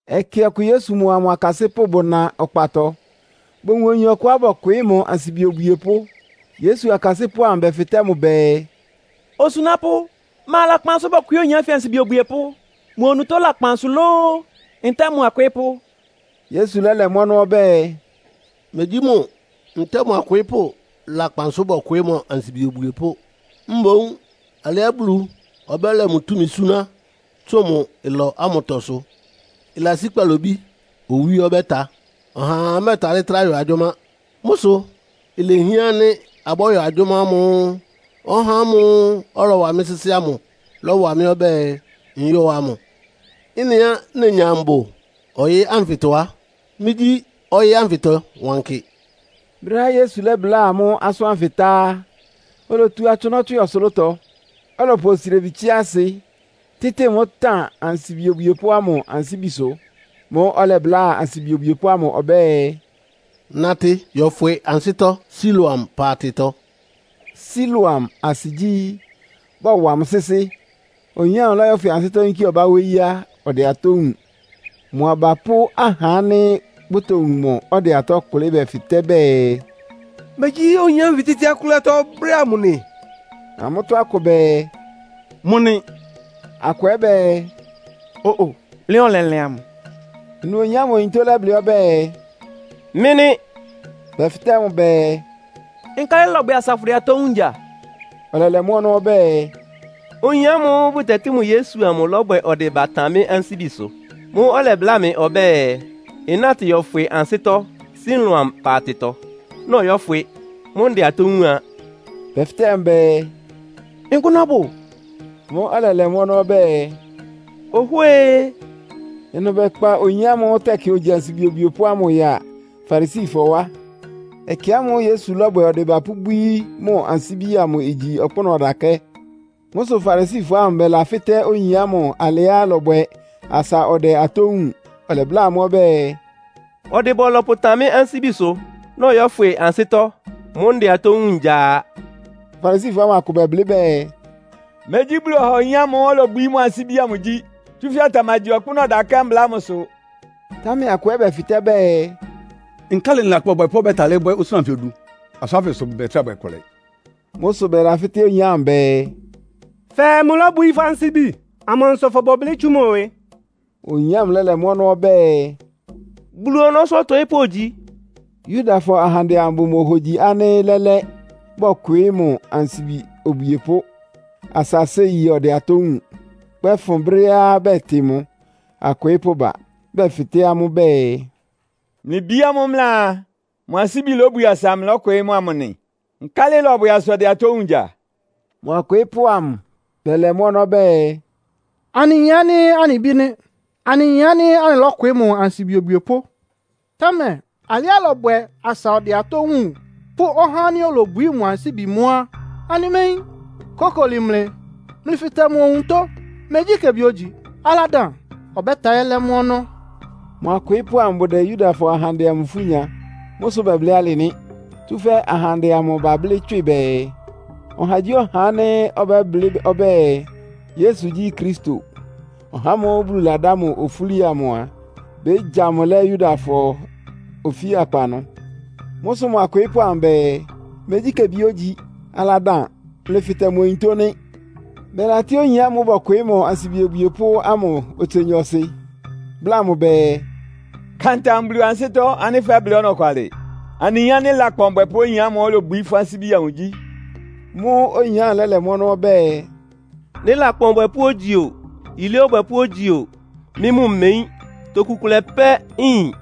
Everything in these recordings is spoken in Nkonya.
Ɛkɛ ɔkʋ Yesu mʋa mʋ akasɩ́pʋ́ bʋna ɔkpatɔ, bowun oyin ɔkʋá bɔkwɩɩ́ mʋ ansibi obwiepʋ́. Yesu akasɩ́pʋ́ amʋ bɛfɩtɛ́ mʋ bɛɛ, “Osunápʋ́, ma lakpan sʋ́ bɔkwɩɩ́ oyin ánfɩ ansibi obwiepʋ́? Mʋ onutó lakpan sʋ lóó, ntɛ́ɛ mʋ akwɩɩ́pʋ́?” Yesu lɛ́lɛ mʋ́ ɔnɔ́ ɔbɛ́ɛ, “Megyí mʋ ntɛ́ɛ mʋ akwɩɩ́pʋ́ lakpan sʋ bɔkwɩɩ́ mʋ ansibi obwiepʋ́. Mboún alɩá Bulu ɔbɛ́lɛ mʋ túmi súná tsʋn mʋ ɩlɔ ámʋtɔ sʋ. Ɩlasí kpalobí owí ɔbɛ́ta. Ɔhaa mɛ́ɛtalɩ́ trá yɔ agyʋ́má. Mʋ́ sʋ ilehián ánɩ́ abɔ́yɔ agyʋ́má ámʋ́ʋ́ ɔhá ámʋ́ʋ́ ɔlɔwa mɩ́ sɩ́sɩ́ ámʋ lɔ́wa mɩ́ ɔbɛ́ɛ nyɔ́ɔ amʋ. Ɩ́nɩá nenya mbʋ ɔyɩ́ ánfɩtɔ á, mɩ́gyí ɔyɩ́ ánfɩtɔ wankɩ.” Brɛ́á Yesu lɛ́bláa amʋ́ asʋ́n ánfɩ tá á, olotu atsʋnɔ́ tswɩ ɔsʋlʋ́tɔ, ɔlɔpʋ osrebi tsɩ́á ɩsɩ, tɩ́tɩ mʋ́ tan ansibi obwiepʋ́ ámʋ ansíbisʋ. Mʋ́ʋ́ ɔlɛbláa ansibi obwiepʋ́ ámʋ ɔbɛ́ɛ, “Natɩ yɔfwɩ ansɩ́tɔ́ Siloam paatɩtɔ.” (Siloam asɩ gyí, “Bɔwa mʋ sɩ́sɩ́.”) Oyin ámʋ lɔ́yɔ́fwɩ ansɩ́tɔ́ yínkí ɔbá wóyí á, ɔdɛ atɔ́ wúun. Mʋ aba pʋ́ ahá ánɩ́ bʋtowun mʋ ɔdɛ atɔ́ kʋlɩ́ bɛfɩtɛ́ bɛɛ, “Megyí oyin ánfɩ tetsíá kʋ́lɩ́ atɔ́ brɛ́ ámʋ nɩ?” Amʋ́tɔ́ akʋ bɛɛ, “Mʋ nɩ!” Akʋ ɛ́ bɛɛ, “Ó-o, lɩ́an ɔlɛlɩan mʋ.” Ɩnʋ oyin ámʋ onutó lɛ́blɩ́ ɔbɛ́ɛ, “Mɩ́ nɩ́.” Bɛfɩtɛ́ mʋ bɛɛ, “Nkálɩ ɩlɔbwɛ asa fʋdɛ atɔ́ wúun ngya?” Ɔlɛlɛ mʋ́ ɔnɔ́ ɔbɛ́ɛ, “Oyin ámʋ́ʋ́ bʋtɛtɩ́ mʋ Yesu amʋ lɔ́bwɛ ɔdɩba tan mɩ́ ansíbisʋ. Mʋ́ʋ́ ɔlɛbláa mɩ ɔbɛ́ɛ, nnátɩ yɔfwɩ ansɩ́tɔ́ Siloam paatɩtɔ. Nɔyɔ́fwɩ, mʋ́ʋ́ ndɛ atɔ́ wúun a.” Bɛfɩtɛ́ mʋ bɛɛ, “Nkʋ́nʋ́ ɔbʋ?” Mʋ́ʋ́ ɔlɛlɛ mʋ́ ɔnɔ́ ɔbɛ́ɛ, “Ohwée.” Ɩnʋ bɛkpa oyin ámʋ́ʋ́ tɛkɩ ogyi ansibi obwiepʋ́ ámʋ yáa Farisifɔ wá. Ɛkɛ ámʋ́ʋ́ Yesu lɔ́bwɛ ɔdɩba pʋ́bwíí mʋ ansíbi amʋ igyi ɔkpʋ́nʋ́ ɔdakɛ́. Mʋ́ sʋ Farisifɔ ámʋ bɛlafɩ́tɛ́ oyin ámʋ alɩá ɩlɔbwɛ asa ɔdɛ atɔ́ wúun. Ɔlɛbláa amʋ́ ɔbɛ́ɛ, “Ɔdɩba ɔlɔpʋtan mɩ́ ansíbisʋ, nɔyɔ́fwɩ ansɩ́tɔ́. Mʋ́ʋ́ ndɛ atɔ́ wúun ngya a.” Farisifɔ ámʋ akʋ bɛblɩ́ bɛɛ, “Megyí Bulu ɔha oyin ámʋ́ʋ́ olobwií mʋ ansíbi amʋ gyí, tsúfɛ́ ɔtamagyi ɔkpʋ́nʋ́ ɔdakɛ́ mbla ámʋsʋ.” Támɛ akʋ ɛ́ bɛfɩtɛ́ bɛɛ, “Nkálɩ lakpan ɔbwɛpʋ́ ɔbɛ́talɩ́ bwɛ́ osúna anfɩ odu? Asʋ́n ánfɩ sʋ bʋmɛtrá bwɛ kʋlɛ.” Mʋ́ sʋ bɛlafɩ́tɛ́ oyin ámʋ bɛɛ, “Fɛɛ mʋlóbwií fʋ́ ansíbi. Amansʋ fʋbʋ blɩ́ tsú mʋ ɩwɩ?” Oyin ámʋ lɛ́lɛ mʋ́ ɔnɔ́ ɔbɛ́ɛ, “Bulu ɔnɔ́sʋ́ ɔtɔɩ́pʋ́ ogyi.” Yudafɔ ahandɛ amʋ bʋmohogyi ánɩ́ lɛ́lɛ́, bɔkwɩɩ́ mʋ ansibi obwiepʋ́ asa séi ɔdɛ atɔ́ wúun, kpɛ́fʋn brɛ́á bɛtɩ mʋ akwɩɩ́pʋ́ ba. Bɛfɩtɛ́ amʋ́ bɛɛ, “Mlɩ bí ámʋ́ʋ́ mlɩaa, mʋ ansíbi lobwie asa mlɩlɔ́kwɩɩ́ mʋ amʋ nɩ? Nkálɩ ɩlɔbwɛ asa ɔdɛ atɔ́ wúun ngya?” Mʋ akwɩɩ́pʋ́ amʋ bɛlɛ mʋ́ ɔnɔ́ bɛɛ, “Anɩyin ánɩ́ anɩ bí nɩ́. Anɩyin ánɩ́ anɩlɔ́kwɩɩ́ mʋ ansibi obwiepʋ́. Támɛ alɩá ɩlɔbwɛ asa ɔdɛ atɔ́ wúun pʋ́ ɔhá ánɩ́ olobwií mʋ ansíbi mʋ́ á, anɩméyín. Kókoli mlɩ, mlɩfɩtɛ mʋ onutó. Megyí kebi ógyi, aladan. Ɔbɛ́talɩ́ lɛ́ mʋ́ ɔnɔ́.” Mʋ akwɩɩ́pʋ́ amʋ bʋdɛ Yudafɔ ahandɛ amʋ ifú nya. Mʋ́ sʋ bɛblɩ́ alɩ nɩ́. Tsúfɛ́ ahandɛ amʋ bablɩ́ tswɩ bɛɛ, ɔhagyíɔha ánɩ́ ɔbɛ́blɩ́ ɔbɛ́ɛ, Yesu gyí Kristo, (ɔhá ámʋ́ʋ́ Bulu ladá mʋ ofúli amʋ) a, bégya mʋ lɛ́ Yudafɔ ofíakpa ɩnʋ. Mʋ́ sʋ mʋ akwɩɩ́pʋ́ amʋ bɛɛ, “Megyí kebi ógyi, aladan, mlɩfɩtɛ mʋ onutó!” nɩ́. Bɛlatɩ́ oyin ámʋ́ʋ́ bɔkwɩɩ́ mʋ ansibi obwiepʋ́ ámʋ otse nyɔɔsɩ, bláa mʋ bɛɛ, “Ka ntam Bulu ansɩ́tɔ́ ánɩ́ fɛ́blɩ́ ɔnɔkwalɩ. Anɩyin ánɩ́ lakpan ɔbwɛpʋ́ oyin ámʋ́ʋ́ olobwií fʋ́ ansíbi amʋ gyí.” Mʋ́ʋ́ oyin ámʋ lɛ́lɛ mʋ́ ɔnɔ́ ɔbɛ́ɛ, “Nɩ́ lakpan ɔbwɛpʋ́ ogyi o, yilé ɔbwɛpʋ́ ogyi o, mɩ́ mʋ́ mmeyín. Toku kʋlɛ pɛ́ nyin.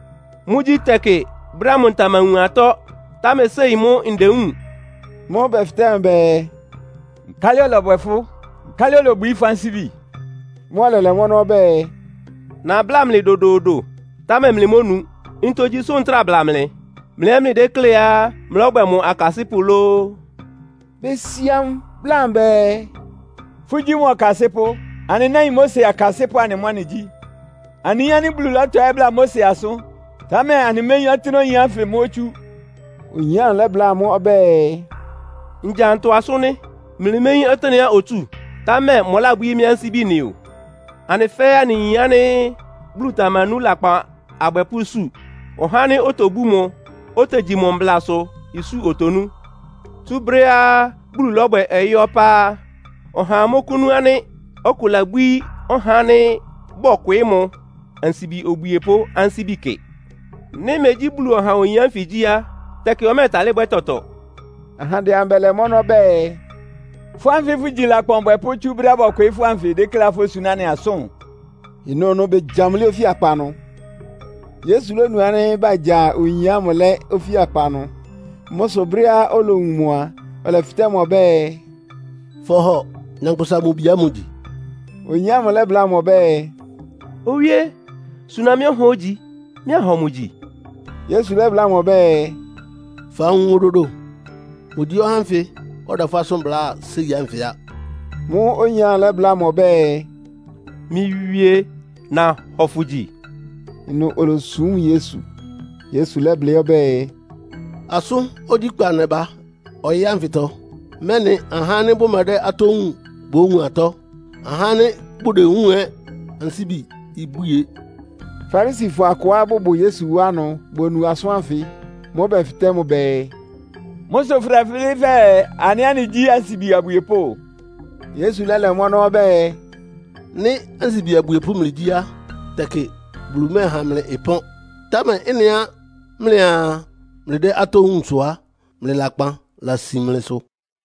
Mʋ́gyí, tɛkɩ brɛ́ ámʋ ntamawun atɔ́, támɛ séi mʋ́ ndewúun.” Mʋ́ʋ́ bɛfɩtɛ́ mʋ bɛɛ, “Nkálɩ ɔlɔbwɛ fʋ́? Nkálɩ olobwií fʋ́ ansíbi amʋ?” Mʋ́ʋ́ ɔlɛlɛ mʋ́ ɔnɔ́ ɔbɛ́ɛ, “Nabláa mlɩ dodoodo, támɛ mlɩmónu. Ntogyi sʋ́ ntráa bla mlɩ? Mlɩ ɛ́ mlɩdékléá mlɔ́bwɛ mʋ akasɩ́pʋ́ lóó?” Besia mʋ, bláa mʋ bɛɛ, “Fʋ́gyí mʋ ɔkasɩ́pʋ́. Anɩ náin Mose akasɩ́pʋ́ anɩ mʋ́ anɩgyí. Anɩyin ánɩ́ Bulu lɔ́tɔɩ́ bláa Mose asʋ́n, támɛ anɩméyín ɔtɩ́nɛ́á oyin ánfɩ mʋ́ otsú.” Oyin ámʋ lɛ́bláa amʋ́ ɔbɛ́ɛ, “Ngya ntɔ asʋ́n nɩ́? Mlɩméyín ɔtɩ́nɛ́á otsú, támɛ mʋlábwíí mɩ́ ansíbi nɩ o. Anɩ fɛ́ɛ́ anɩyin ánɩ́ Bulu tamanú lakpan abwɛpʋ́ isu. Ɔhá ánɩ́ otobú mʋ́, otegyi mʋ mblasʋ isu otonú. Tsú brɛ́á Bulu lɔ́bwɛ ɔyɩ́ ɔpá á, ɔhaa mɔ́kʋ́nú ánɩ́ ɔkʋ labwíí ɔhá ánɩ́ bɔkwɩɩ́ mʋ ansibi obwiepʋ́ ansíbi kɩ. Nɩ́ megyí Bulu ɔha oyin ánfɩ gyí á, tɛkɩ ɔmɛ́ɛtalɩ́ bwɛ́ tɔtɔɔtɔ.” Ahandɛ amʋ bɛlɛ mʋ́ ɔnɔ́ bɛɛ, “Fʋ́ ánfɩ fʋgyi lakpan ɔbwɛpʋ́ tsú brɛ́á bɔkwɩɩ́ fʋ́ ánfɩ dékléá fósuná anɩ asʋ́n?” Ɩnʋnʋ begya mʋ lɛ́ ofíakpa ɩnʋ. Yesu lónu ánɩ́ bagya oyin ámʋ lɛ́ ofíakpa ɩnʋ. Mʋ́ sʋ brɛ́á olowun mʋ a, ɔlɛfɩtɛ́ mʋ ɔbɛ́ɛ, “Fɔhɔ Nyankpʋsa-Mʋ-Bi ámʋ gyi?” Oyin ámʋ lɛ́bláa mʋ ɔbɛ́ɛ, “Owíé, suna mɩ́ ɔhá ánɩ́ ogyi, mɩ́ anhɔ mʋ gyi!” Yesu lɛ́bláa mʋ ɔbɛ́ɛ, “Fawun mʋ dodo. Mʋgyí ɔhá ánfɩ ɔdɛ fʋ́ asʋ́n bláa séi ánfɩ á.” Mʋ́ʋ́ oyin ámʋ lɛ́bláa mʋ ɔbɛ́ɛ, “Mɩ́ Wíé, nahɔ fʋ gyi.” Ɩnʋ olosúm Yesu. Yesu lɛ́blɩ́ ɔbɛ́ɛ, “Asʋ́n ogyíkpa nɛba ɔyɩ́ ánfɩtɔ, mɛ́nɩ ahá ánɩ́ bʋmɛdɛ́ atɔ́ wúun bówun atɔ́. Ahá ánɩ́ bʋdewúun ɛ́ ansíbi ibwie.” Farisifɔ akʋá bʋbʋ Yesu wá ɩnʋ bonu asʋ́n ánfɩ. Mʋ́ʋ́ bɛfɩtɛ́ mʋ bɛɛ, “Mʋ́ sʋ fʋdɛblɩ́ fɛɛ anɩ ɛ́ anɩgyí ansibi abwiepʋ́?” Yesu lɛ́lɛ mʋ́ ɔnɔ́ ɔbɛ́ɛ, “Nɩ́ ansibi abwiepʋ́ mlɩgyí á, tɛkɩ Bulu mɛ́ɛha mlɩ ɩpɔ́n. Támɛ ɩ́nɩá mlɩaa mlɩdɛ́ atɔ́ wúun sʋ á, mlɩ lakpan lasin mlɩsʋ.”